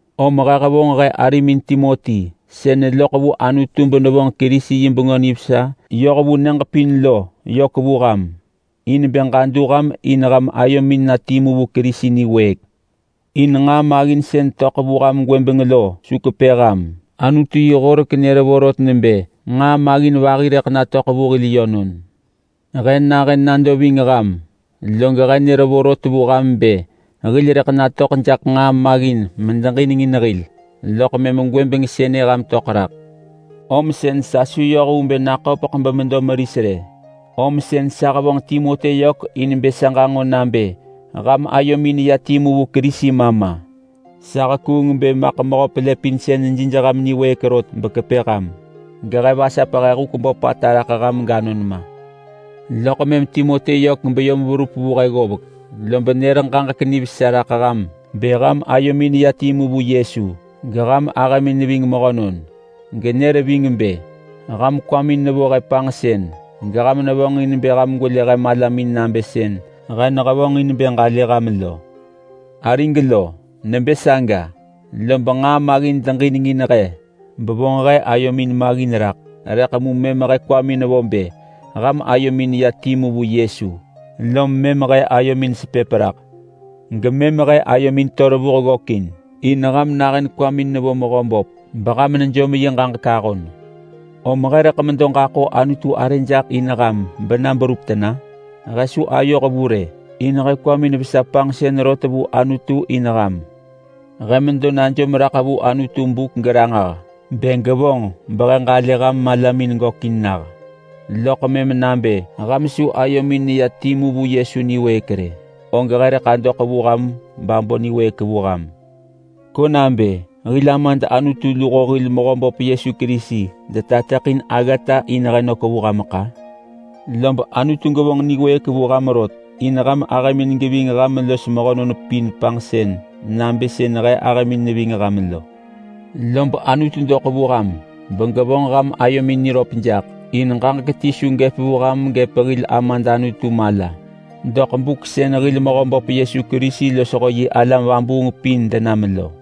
Om he hevonġ he arimin Timoti sën neloḳ vu Anutu benevonġ Kerisi yi Bengö Nivesa yoh vu nyëġ pin lo yök vu ham in bë ġadu ham in ham ayomin na timu vu Kerisi niwëëk. In nġaa maggin sën töḳ vu ham gwëbeng lo su kepë ham. Anutu yi horek nër vorot nebë nġaa maggin vahi rëḳ natöḳ vu hil yönon. He nahën nado ving ham, log he nër ranġah vu ham bë hil rëḳ natöḳ jaḳ nġaa maggin medeġinengin hil, loḳ mëm gwëbeng sënë ham töḳ raḳ. Om sën sa su yoh vu bë naköpeḳ bemedo meris rë, om sën sa hevonġ Timoti yök in bë sa ġanġo nabë ham ayomin neya timu vu Kerisi ma ma. Sa hekuung bë Mehö Pelëpinsën maḳ jij ham niwëëk rot bekepë ham gehe vasap he huk böpata raḳ ham ganon ma. Loḳ mëm Timoti yök beyom verup vu he ggovek, lob nër ġaġek nivesa raḳ ham bë ham ayomin neya timu vu Yesu, geham ahëmin neving mehönon. Genër ving bë ham kwamin nevo he panġsën geham nevonġin bë ham gwelë he malamin nabë sën he nehevonġin bë ġalë ham lo. Arig lo! Nebë saga lob nġaa maggin deġinengin he bevonġ he ayomin maggin raḳ, rëḳ mu mëm he kwamin vo bë ham ayomin neya timu vu Yesu lom mëm he ayomin sepëp raḳ. Gemëm he ayomin to revuh ggökin, in ham nahën kwamin nevo Mehöböp beham nejom yi ġaġek ahon. Om he rëḳ ġaḳo Anutu arë jaḳ in ham bena berup tena? He su ayoh vu rë, in he kwamin vesa panġsën rot vu Anutu in ham. He medo najom raḳ vu Anutu buk geranġah nebë gevonġ behe ġalë ham malamin gökin nah, loḳ mëm nabë ham su ayomin neya timu vu Yesu niwëëk rë, og he rëḳ adoḳ vu ham babo niwëëk vu ham. Ko nabë hil Amad Anutu luho hil Mehöböp Yesu Kerisi detateḳin aggata in he nök vu hameḳ-a! Lob Anutu gevonġ niwëëk vu ham rot, in ham ahëmin geving ham los mehönon pin panġsën nabë sën he ahëmin neving ham lo. Lob Anutu doḳ vu ham megevonġ ham ayomin niröp jaḳ in ġaġek ti su gëp vu ham gëp hil Amad Anutu mala doḳ buk sën hil Mehöböp Yesu Kerisi losho yi alam vabuung pin denam lo.